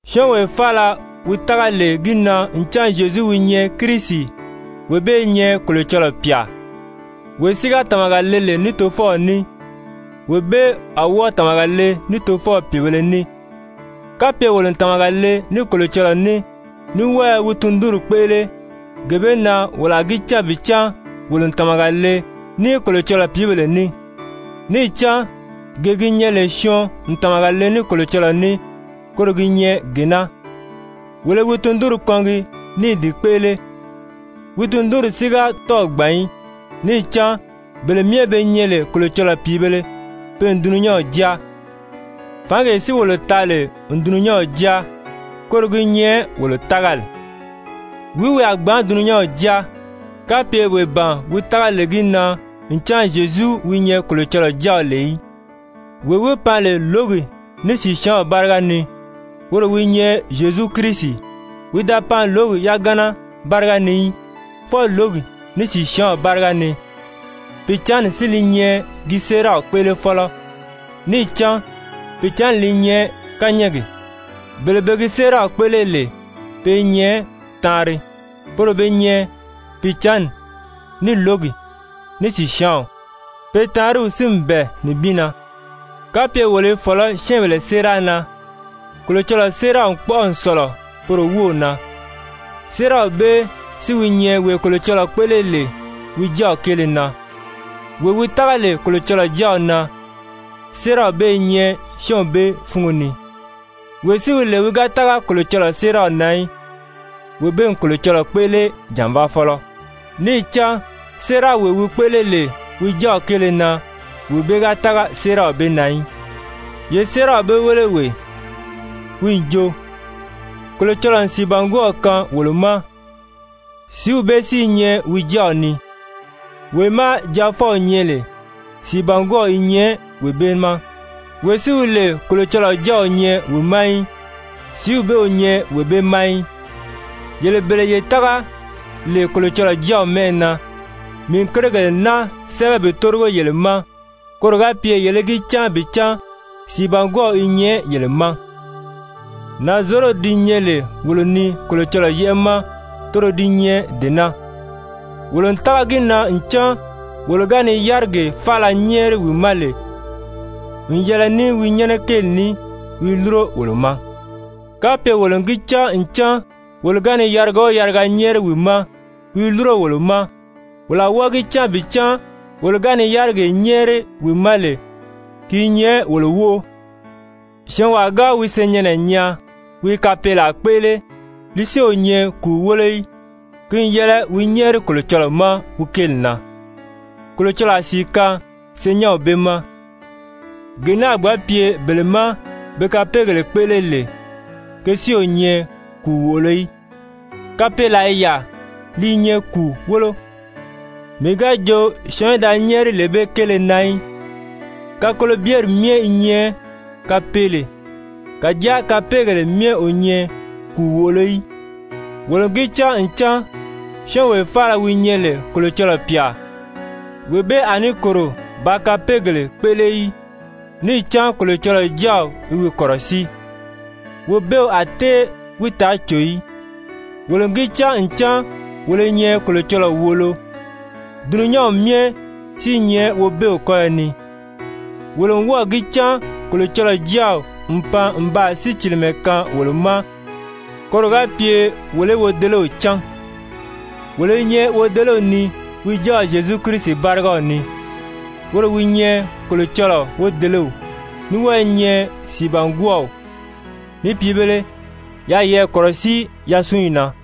Syɔ́ɔnwee faala wi tága lè gi na ncan Zyezu wi nyɛ Kirisi, wee bee i nyɛ Kolocɔlɔɔ pyà, wee si ga tàmaga le lè ní Tofɔw ní, wee bee a wɔ́ɔ tàmaga le ní Tofɔw pìibēle ní. Kapye wolo n tàmaga le ní Kolocɔlɔɔ ní, ní wɔ́ɔ i wi tundunri kpéʔele, gee bee na wolo a gi cán bi cán wolo n tàmaga le ní Kolocɔlɔɔ pìíbèle ní. Níì cán gee gi nyɛ lè syɔɔn n tàmaga le ní Kolocɔlɔɔ ní, koro gi nyɛ gee naa, wolo i wi tundunri kɔngi ní i di kpéʔele. Wi tundunri si ga tɔ́ɔ̀ gbàn í, níì cán bele myɛ be nyɛ lè Kolocɔlɔɔ pìíbèle, pe n dulunyanw jáa, fǎngee si wolo taa lè n dulunyanw jáa, koro gi nyɛ wolo tágali. Wìí wi a gbǎn dulunyanw jáa, kapye wee ban wi tága lè gi na ncan Zyezu wi nyɛ Kolocɔlɔɔ Jáaw lè í? Wee wi pan lè lǒgi ní sìsyaanw báriga ni, woro wi nyɛ Zyezu Kirisi. Wi da pan lǒgi yagana báriga ni í, fwɔɔ lǒgi, ní sìsyaanw báriga ni, Pìicǎnni si li nyɛ gi séeraw kpéʔelefɔlɔ, níì cán Pìicǎnni li nyɛ kányɛɛgi. Bele be gi séeraw kpéʔele lè pe i nyɛ taanri. Poro be nyɛ Pìicǎnni, ní lǒgi, ní sìsyaanw. Pe taanriw si n bɛ̀ɛ nibin na. Kapye wolo i fɔ̀lɔ́ syɛ́ɛnbèle séera na, Kolocɔlɔɔ séeraw n kpɔ́ʔɔ n sɔ̀lɔ poro wów na. Séeraw bee si wi nyɛ wee Kolocɔlɔɔ kpéʔele lè wi Jáaw kéele na. Wee wi tága lè Kolocɔlɔɔ Jáaw na, séeraw bee i nyɛ syɔ́ɔnw bee fúngo ni. Wee si wi lè wi ga tága Kolocɔlɔɔ séeraw na í, wee bee n Kolocɔlɔɔ kpéʔele jànvaafɔlɔ, níì cán séerawee wi kpéʔele lè wi Jáaw kéele na, wee bee ga tága séeraw bee na í. Ye séeraw bee wéle wee, wi n jo, Kolocɔlɔɔ n sìibangwɔɔw kaan wolo ma, sìíw bee si i nyɛ wi Jáaw ni. Wee má Jaafɔw nyɛ lè, sìibangwɔɔw i nyɛ wee bee ma. Wee si wi lè Kolocɔlɔɔ Jáaw o nyɛ wi ma í, sìíw bee o nyɛ wee bee ma í. Yele bele ye tága lè Kolocɔlɔɔ Jáaw mɛ́ʔɛ na, mii n kérigèle naa sɛ́bɛ bi tórigo yele ma koro ga pye yele í gi cán bi cán sìibangwɔɔw i nyɛ yele ma. Nànzorodi di nyɛ lè wolo ni Kolocɔlɔɔ yɛ́ʔɛ ma, toro di nyɛ dee naa, wolo n tága gi na ncan wolo ga ni yárigee faala nyɛ́ɛri wi ma lè n yɛlɛ ní wi nyɛnɛ kéeli ní, wi i lúro wolo ma. Kapye wolo n gi cán ncan wolo ga ni yariga o yariga nyɛ́ɛri wi ma, wi i lúro wolo ma, wolo a wɔ́ɔ gi cán bi cán wolo ga ni yárigee nyɛ́ɛri wi ma lè, ki i nyɛ wolo wóʔo. Syɔɔnwaa ga wi senyɛnnɛ nyaa wi i kapeelaa kpéʔele li si o nyɛ kùu wólo í, ki n yɛlɛ wi nyɛ́ɛri Kolocɔlɔɔ ma wi kéeli na, Kolocɔlɔɔ a sìi kaan senyɛnw bee ma. Gee naa a gbǎn pye bele má be kapeegèle kpéʔele lè, ke si o nyɛ kùu wòʔolo í. Kapeelaa i yaà, li i nyɛ kùu wólo, mii ga jo syɔɔn í da nyɛ́ɛri lee bee kéele na í. Kakolobyeri myɛ i nyɛ kapeele, kàjáa kapeegèle myɛ o nyɛ kùu wòʔolo í. Wolo n gi cán ncan syɔ́ɔnwee faala wi nyɛ lè Kolocɔlɔɔ pyà, wee bee a ní kòro bàā kapeegèle kpéʔele í. Níì cán Kolocɔlɔɔ Jáaw i wi kɔ̀rɔsíi, Wobeew a tée wi taa cò í. Wolo n gi cán ncan wolo i nyɛ Kolocɔlɔɔ wòolo, dulunyanw myɛ si i nyɛ Wobeew kɔ́yɔ ni. Wolo n wɔ́ɔ̀ gi cán Kolocɔlɔɔ Jáaw n pan n baa sícilimɛ kaan wolo ma koro ga pye wolo í Wodelew cán. Wolo i nyɛ Wodelew ni wi Jáaw Zyezu Kirisi bárigaw ni. Woro wi nyɛ Kolocɔlɔɔ wodelew, ní wɔ́ɔ i nyɛ sìibangwɔɔw. Ni pìibēle, yaa yeyɛɛ kɔ̀rɔsíi yasunyi na.